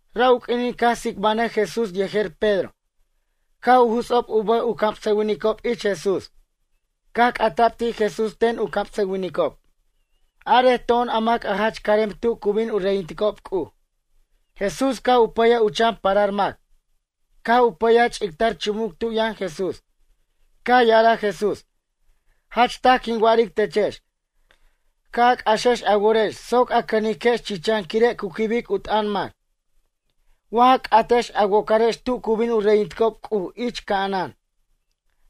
Ra' u q'uinin caj tsicbanʌj Jesús yejer Pedro caj u juts'ob u bʌj u camsʌwinicob ich Jesús. Caj c'ata'b ti' Jesús ten u camsʌwinicob: ―Arej to'on a mac jach carem tu cu bin u reyinticob C'uj? Jesús caj u pʌyaj u chan parar mac. Caj u pʌyaj ch'ictar chumuc tu yʌn Jesús. Caj ya'araj Jesús: ―Jach taj quin wa'aric techex. Ca' a c'axex a worex soc a cʌniquex chichan quire' cu quibic u t'ʌn mac. Wa ja c'atex a wocarex tu cu bin u reyinticob C'uj ich ca'anan.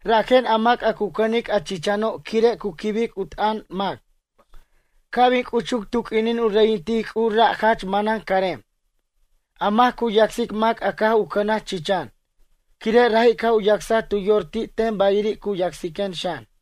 Rajen a mac a cu cʌnic a chichano' quire' cu quibic u t'ʌn mac ca' bin c'uchuc tu q'uinin u reyintic C'uj ra' jach manan carem. A mac cu yacsic mac a caj u cʌnaj chichan, quire' raji' caj u yacsaj tu yor ti' ten bayiri' cu yacsiquen xan.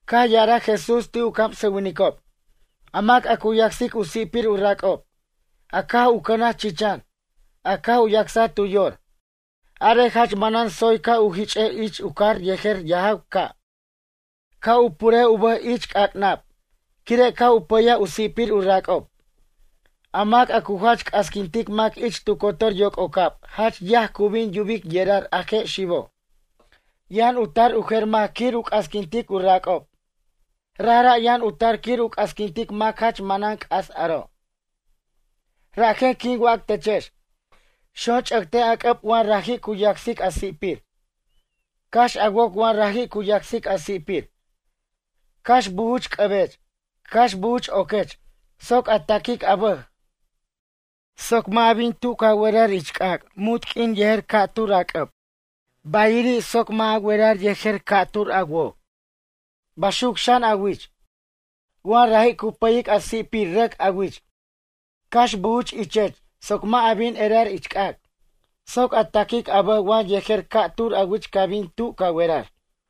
Caj ya'araj Jesús ti' u camsʌwinicob: ―A mac a cu yacsic u si'pir u rac'ob, a caj u cʌnaj chichan, a caj u yacsaj tu yor. Arej jach manan tsoy ca' u jich'ej ich u car yejer yajaw ca'. Ca' u purej u bʌj ich c'ac'nab quire' caj u pʌyaj u si'pir u rac'ob. A mac cu jach c'asquintic mac ich tu cotor yoc'ocab jach yaj cu bin yubic yerar a je' xibo'. Yʌn u tar u jer mac quir u c'asquintic u rac'ob. Rajra' yʌn u tar quir u c'asquintic mac jach manan c'as aro'. ’Rajen quin wac techex: Xonch'ʌctej a c'ʌb wa raji' cu yacsic a si'pir. Cax a woc wa raji' cu yacsic a si'pir. Cax bujuch c'ʌbech, cax bujuch oquech soc a taquic a bʌj. Soc mʌ' a bin tu ca werar ich c'ac' munt q'uin yejer ca'tur a c'ʌb. Bayiri' soc mʌ' a werar yejer ca'tur a woc. Baxuc xan a wich. Wa raji' cu pʌyic a si'pir rʌc a wich. Cax bujuch ichech soc mʌ' a bin erar ich c'ac'. Soc a taquic a bʌj wa yejer ca'tur a wich ca bin tu ca werar.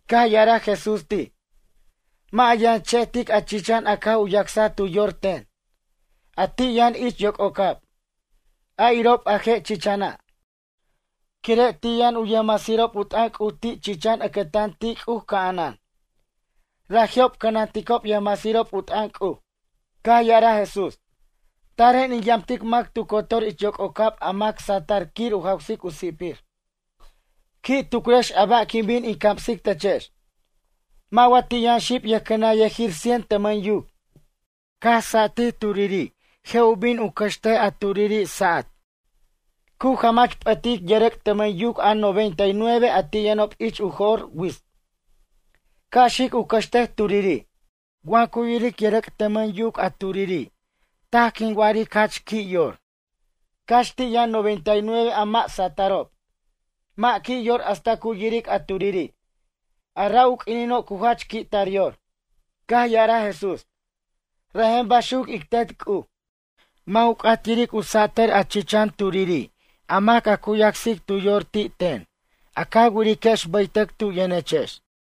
Caj ya'araj Jesús ti': ―Mʌ' a yʌn che'tic a chichan a caj u yacsaj tu yor ten, a ti' yʌn ich yoc'ocab, a irob a je' chichana'. Quire' ti' yʌn u yʌjmasirob u t'ʌn C'uj ti' chichan ʌcʌtan ti' C'uj ca'anan. Raji'ob cʌnanticob yʌjmasirob u t'ʌn C'uj. Caj ya'araj Jesús: ―Taren in yamtic mac tu cotor ich yoc'ocab a mac satʌr quir u jawsic u si'pir. ’Qui' tucrex a ba' quin bin in camsic techex. Mʌ' wa ti' yʌn xib yʌjcʌnʌnyʌjir cien tʌmʌn yuc. Caj satij turiri' je' u bin u cʌxtej a turiri' sa'at. Cu jamach p'ʌtic yʌrʌc' tʌmʌn yuc a noventa y nueve a ti' yʌnob ich u jo'r wits, ca' xic u cʌxtej turiri'. Wa cu yiric yʌrʌc' tʌmʌn yuc a turiri' taj quin wa'aric jach qui' yor. Cax ti' yʌn a noventa y nueve a mʌ' sa'atʌrob. Mʌ' qui' yor hasta cu yiric a turiri', a ra' u q'uinino' cu jach qui' tar yor. Caj ya'araj Jesús: ―Rajen baxuc ic Tet C'uj. Mʌ' u c'at yiric u satʌr a chichan turiri' a mac a cu yacsic tu yor ti' ten, a ca wiriquex bʌytʌc tu yʌnechex.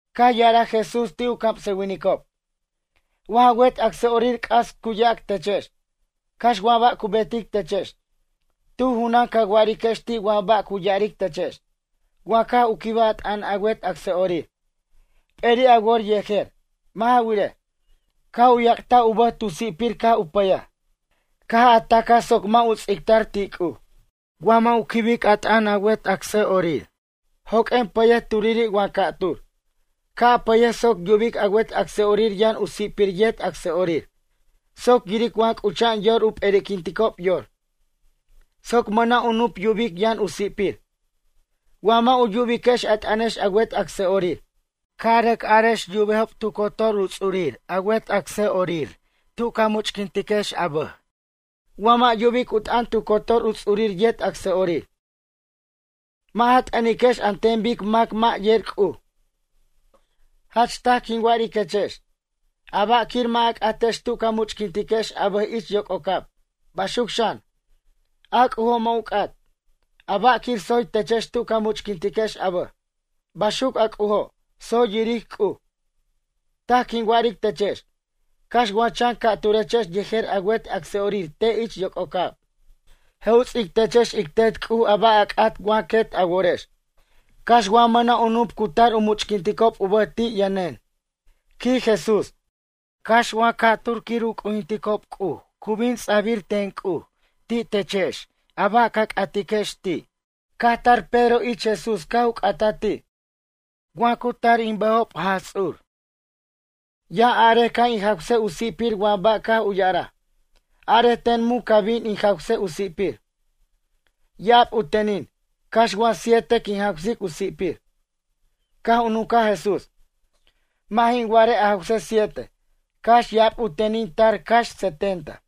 Caj ya'araj Jesús ti' u camsʌwinicob: ―Wa ja wet acsa'orir c'as cu yac techex. Cax wa ba' cu betic techex. Tu junan ca wa'ariquex ti' wa ba' cu ya'aric techex. Wa caj u quibaj a t'ʌn a wet acsa'orir, p'eri' a wor yejer. Mʌ' ja wirej, caj u yac'taj u bʌj tu si'pir caj u pʌyaj. Caj a tacaj soc mʌ' u ts'ictar ti' C'uj. Wa mʌ' u quibic a t'ʌn a wet acsa'orir, joq'uen pʌyej turiri' wa ca'tur. Ca' a pʌyej soc yubic a wet acsa'orir yʌn u si'pir yet acsa'orir. Soc yiric wa c'ucha'an yor u p'eri'quinticob yor. Soc mʌna' u nup yubic yʌn u si'pir. Wa mʌ' u yubiquex a t'ʌnex a wet acsa'orir, ca' a rʌc arex yubejob tu cotor u ts'urir a wet acsa'orir tu ca much'quintiquex a bʌj. Wa mʌ' yubic u t'ʌn tu cotor u ts'urir yet acsa'orir. Mʌ' ja t'ʌniquex an ten bic mac mʌ' yer C'uj. Jach taj quin wa'ariquechex: ―A ba' quir mʌ' a c'atex tu ca much'quintiquex a bʌj ich yoc'ocab, baxuc xan, a C'ujo' mʌ' u c'at. A ba' quir tsoy techex tu ca much'quintiquex a bʌj, baxuc a C'ujo', tsoy yiric C'uj. ’Taj quin wa'aric techex. Cax wa chan ca'turechex yejer a wet acsa'orir te' ich yoc'ocab. Je' u ts'ic techex ic Tet C'uj a ba' a c'at wa quet a worex. Cax wa mʌna' u nup cu tar u much'quinticob u bʌj ti' yʌnen ―quij Jesús―. Cax wa ca'tur quir u c'ujinticob C'uj cu bin ts'abir ten C'uj ti' techex a ba' ca c'atiquex ti'. Caj tar Pedro ich Jesús caj u c'ataj ti': ―Wa cu tar in bʌjob, Jaj Ts'ur. Ya'arej ca' in jawsej u si'pir wa ba' caj u ya'araj. Arej ten mun ca' bin in jawsej u si'pir. Ya'ab u tenin, cax wa siete quin jawsic u si'pir? Caj u nuncaj Jesús: ―Mʌ' jin wa'arej a jawsej siete, cax ya'ab u tenin u tar cax setenta.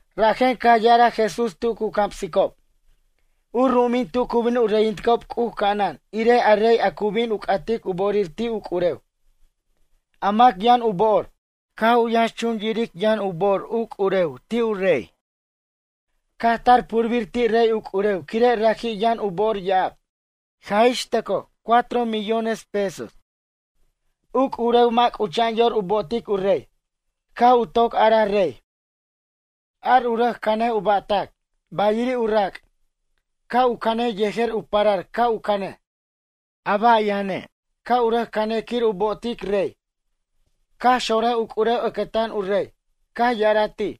Rajen caj ya'araj Jesús tu cu camsicob: ―U ru'umin tu cu bin u reyinticob C'uj ca'anan irej a rey a cu bin u c'atic u bo'orir ti' u c'urew, a mac yʌn u bo'or. Caj u yʌnxchun yiric yʌn u bo'or u c'urew ti' u rey. Caj tar purbir ti' rey u c'urew quire' raji' yʌn u bo'or ya'ab. Jaj ix tʌcoj cuatro millones pesos. U c'urew mʌ' c'ucha'an yor u bo'otic u rey. Caj u toc araj rey: “Ar u rʌc cʌnej u ba'tac. Bayiri' u rac', ca' u canej yejer u parar ca' u canej. A ba' yʌne', ca' u rʌc canej quir u bo'otic rey.” Caj xonrʌj u c'urew ʌcʌtan u rey. Caj ya'araj ti':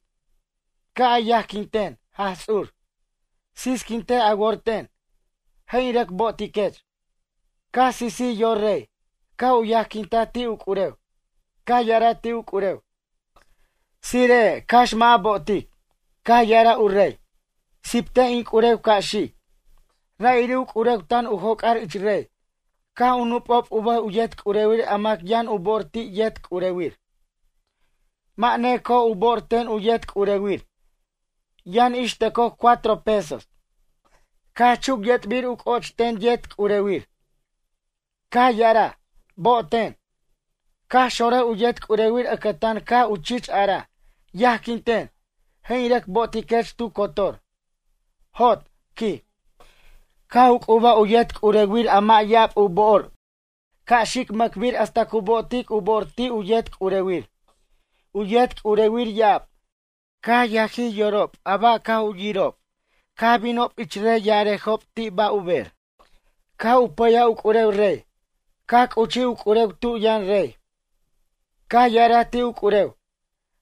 “Ca' a yajquin ten, Jaj Ts'ur. Sisquintej a wor ten. Je' in rʌc bo'otiquech.” Caj sisij yor rey, caj u yajquintaj ti' u c'urew. Caj ya'araj ti' u c'urew: “Tsire'ej cax mʌ' a bo'otic.” Caj ya'araj u rey: “Siptej in c'urew ca' xic.” Ra'iri' u c'urew tan tu joc'ar ich rey caj u nup'ob u bʌj u yet c'urewir a mac yʌn u bo'or ti' yet c'urewir. Mʌ' neco'oj u bo'or ten u yet c'urewir. Yʌn ix tʌcoj cuatro pesos. Caj chuc yʌt'bir u c'o'och ten yet c'urewir. Caj ya'araj: “Bo'oten.” Caj xonraj u yet c'urewir ʌcʌtan Caj u chich araj: “Yajquinten. Je' in rʌc bo'otiquech tu cotor.” “Jot” ―quij―. Caj u c'ubaj u yet c'urewir a mʌ' ya'ab u bo'or ca' xic mʌcbir hasta cu bo'otic u bo'or ti' u yet c'urewir. U yet c'urewir ya'ab, caj yajij yorob a ba' caj u yirob caj binob ich rey ya'arajob ti' ba' u ber. Caj u pʌyaj u c'urew rey. Caj c'uchij u c'urew tu yʌn rey. Caj ya'araj ti' u c'urew: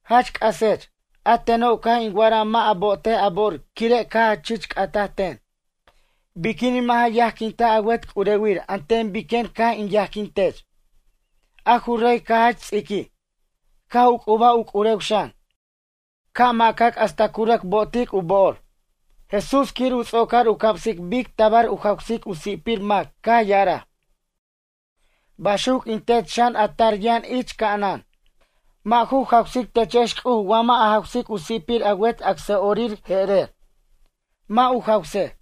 “Jach c'asech, a teno' caj in wa'araj mʌ' a bo'otej a bo'or quire' caj a chich c'ataj ten. Biquinin mʌ' ja yajquintaj a wet c'urewir an ten biquen caj in yajquin tech?” A ju rey caj jach ts'iquij. Caj u c'ubaj u c'urew xan, ca' ma'cac hasta cu rʌc bo'otic u bo'or. Jesús quir u ts'ocar u camsic bic tabar u jawsic u si'pir mac caj ya'araj: ―Baxuc in Tet xan a tar yʌn ich ca'anan. Mʌ' ju jawsic techex C'uj wa mʌ' a jawsic u si'pir a wet acsa'orir je'erer, mʌ' u jawsej.